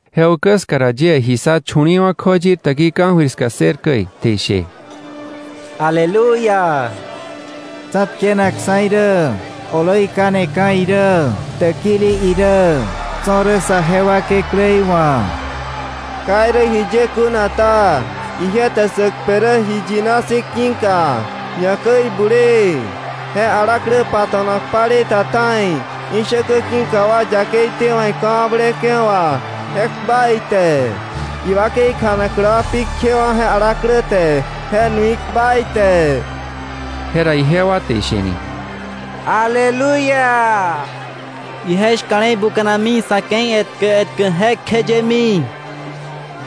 Je ukä ska ra yie ji ssa chu̱li̱i̱wa̱ kjoyir täkii ka̱jöir ska ssër käi, te ishe: “¡ Aleluya! Tsa̱tkeneksa̱ irä, oloi kaneka̱ irä, täkili irä, tso̱ rä sa jewa Kekläí wa̱. Ka irä jiye kuna ta, ije te sä kpe rä ji iyina si̱ ki̱ka, ñakäi bulee. Je alaklä pato̱nak palei ta ta̱i, ishäkä ki̱ka wa yakei tewa̱k ika̱wakblewa̱ wà, je kpa ite. Iwakei kjanaklä wa pi kjewa̱ je alaklä te, je nui kpa ite.” Jera ijewa te ishe ni: “¡Aleluya! Ije shka̱le̱i buka̱nami sa̱ ke̱i etkä etkä jekjeyemi.”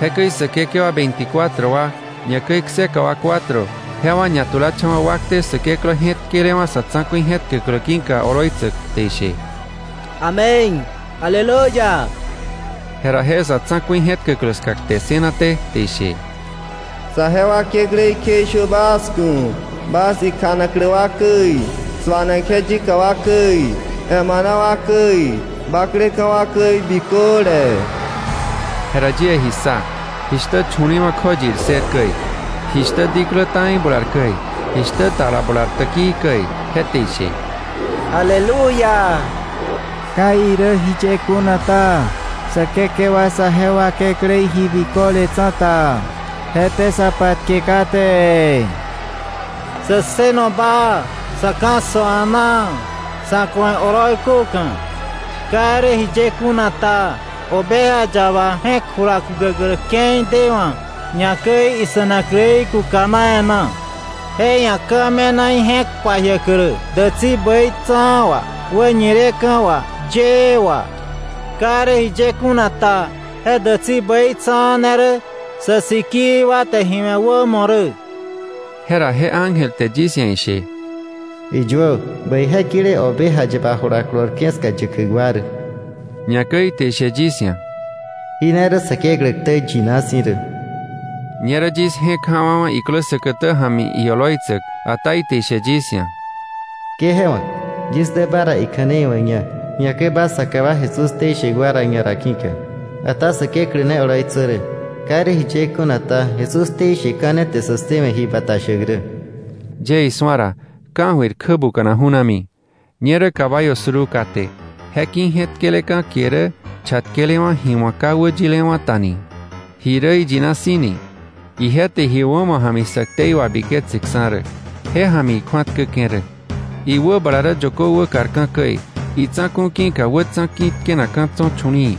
Jekäi säkekewa veinticuatro wa, ñakäi kseka wa cuatro, jewa ñatulacha̱wa̱ wakte Säkeklä je̱tkelewa̱ sa̱ tsa̱ku̱i je̱tkäklä ki̱ka oloitsäk, te ishe: “¡Amén! ¡Aleluya!” Jera je sa̱ tsa̱ku̱i je̱tkäklä ska kte ssënaté, te ishe: “¡Saje wa Kekläí kjeishö bas ku̱ bas ikjanaklä wa käi, suanak ije yika wa käi, emana wa käi, bakleka̱ wa käi biköle.” Jera yie ji ssa, jishtä chu̱li̱i̱wa̱ kjoyir ssër käi, jishtä diklä ta̱i bular käi, jishtä tala bular täkii käi, je te ishe: “¡Aleluya! Ka irä jiye kuna ta, Säkekewa saje wa Kekläí ji biköle tsa̱ta, je te sa patke kate. Sä ssëno baa, sä ka̱ssö a̱naa, sa̱ ku̱ ije oloi köka̱. Ka irä jiye kuna ta, Oveja Yaba je̱k jula kukäklä ke̱i dewa̱, ñakäi ise̱nakläí kukana e̱ná. Je ia̱ ka̱ me̱na ije̱k pajiäklä dätsi bäitsa̱a̱ wà, wäñileka̱ wà, yëë wà, Ka irä jiye kuna ta, je dätsi bäi tsa̱a̱ ne rä sä sikii wa te ji wämo we̱ rä.” Jera je ángel te yis ia̱ ishe: “Iyuö: ‘Bäije kile Oveja Yaba jula kolorke̱ ska yäkäk wa rä.’” Ñakäi ite ishe yis ia̱: “Jí ne rä Säkeklä ktä yina si̱ rä.” Ñerä yis je̱k ja̱wa̱wa̱ iklä säkätä ja̱mi ioloitsäk, ata ite ishe yis ia̱: “Ke je wa̱k, yis dä ba ra ikja̱nei wa̱kña, ñakäi ba saka wa Jesús ktei shäk wa ra ñara ki̱ka. Ata Säkeklä ne oloitsö rä. Ka irä jiye kuna ta, Jesús ktei sheka̱ ne te sä ssëwe̱ ji bata shäk rä.” Yie isu̱a ra, ka̱jöir kjä buka̱na ju̱nami. Ñerä caballo suruu kate, je ki̱ je̱tkeleka̱ kie rä Chatkelewa̱ Ji Wa̱k Ka Wäyilewa̱ Ta ni, Ji Rä Iyina Si̱ ni. Ije te ji wämo ja̱mi sä ktei wabiketseksa̱ rä, je ja̱mi ikju̱atkäke̱ rä. Iwäbala rä yökö wäkarka̱ käi, itsa̱ku̱ ki̱ka wätsa̱ ki̱ tkenakka̱ tso̱ chu̱li̱i̱,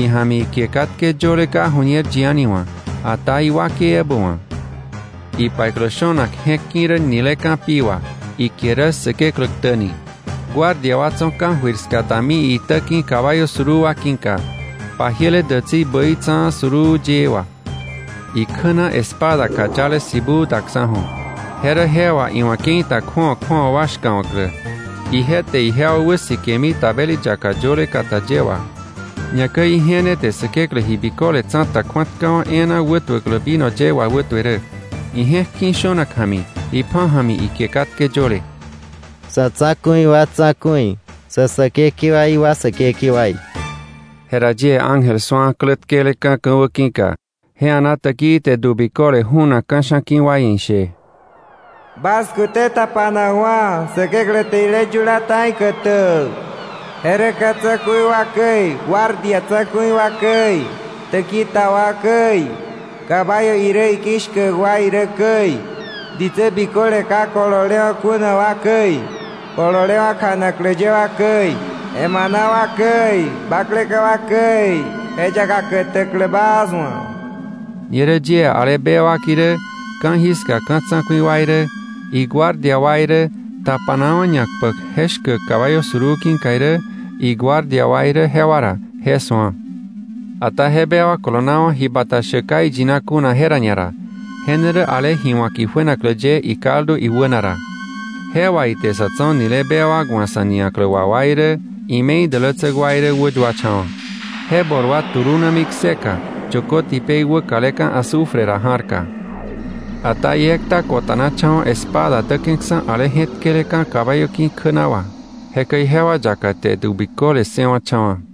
ija̱mi ikie katke yöle ka ju̱ñer yi a̱ni wa̱, ata iwakei ebä wa̱. Ipaiklä shönak je̱k ki̱ rä nileka̱ pi wà; ikie rä Säkeklä Ktä ni. Guardia wa tso̱ ka̱jöir ska dami iitä ki̱ caballo suruu wa ki̱ka, pajiele dätsi bäitsa̱a̱ suruu yëë wà. Ikjä na espada kayale sibuu daksa̱ju̱, je rä je wà iwa̱ ke̱i ta kju̱awa kju̱awa wa shka̱wa̱klä. Ije te ijewa wäsikemi tabeli yaka yöle kata ye wà. Ñakäi ije ne te Säkeklä Ji Biköle Tsa̱ta kju̱atkawa̱ e̱e̱na wätuäklä vino ye wawätue rä. Ije̱k ki̱ shönak ja̱mi, ipja̱ ja̱mi ikie katke yöle: SA̱ TSA̱KU̱I WA TSA̱KU̱I SÄ SÄKEKEWAI WA SÄKEKEWAI Jera yie ángel ekla su̱a klä tkeleka̱ ka̱wä ki̱ka, je a̱naa täkii te du biköle junak ka̱sha̱ ki̱ wa ia̱ ishe: “Bas kute tapanakwa̱, Säkeklä te jile yula ta̱i kätäk. Je rä ka̱ tsa̱ku̱i wa käi, guardia tsa̱ku̱i wa käi, täki ta wa käi, caballo irä iki̱ shkäk wa irä käi, ditsä biköle ka kololewa̱ kuna wa käi, kololewa̱ kjanaklä ye wa käi, emana wa käi, bakleka̱ wa käi, je yaka kätäklä bas wa̱.” Ñerä yie ale bewak irä, ka̱jiska ka̱ tsa̱ku̱i wa irä, iguardia wa irä, tapanawa̱ ñakpäk je shkäk caballo suruu ki̱ka irä, iguardia wa irä jewa ra, je su̱a. Ata je bewak kolonawa̱, ji bata shäk ka iyina kuna je ra ñara, je ne rä ale ji wa̱k ijuenaklä ye ikaldu iwäna ra. Je wà ite sa̱ tso̱ nile bewak wa̱ sa̱ niaklä wà wa irä, ime̱i dälätsäk wa irä wäyuacha̱wa̱. Je bol wa tulunami kseka yökö tipei wäkaleka̱ azufre ra ja̱rka. Ata iekta ko̱ta̱nacha̱wa̱ espada däke̱ksa̱ ale je̱tkeleka̱ caballo ki̱ kjä na wà. Jekäi jewa yaka te du biköle ssëwa̱cha̱wa̱.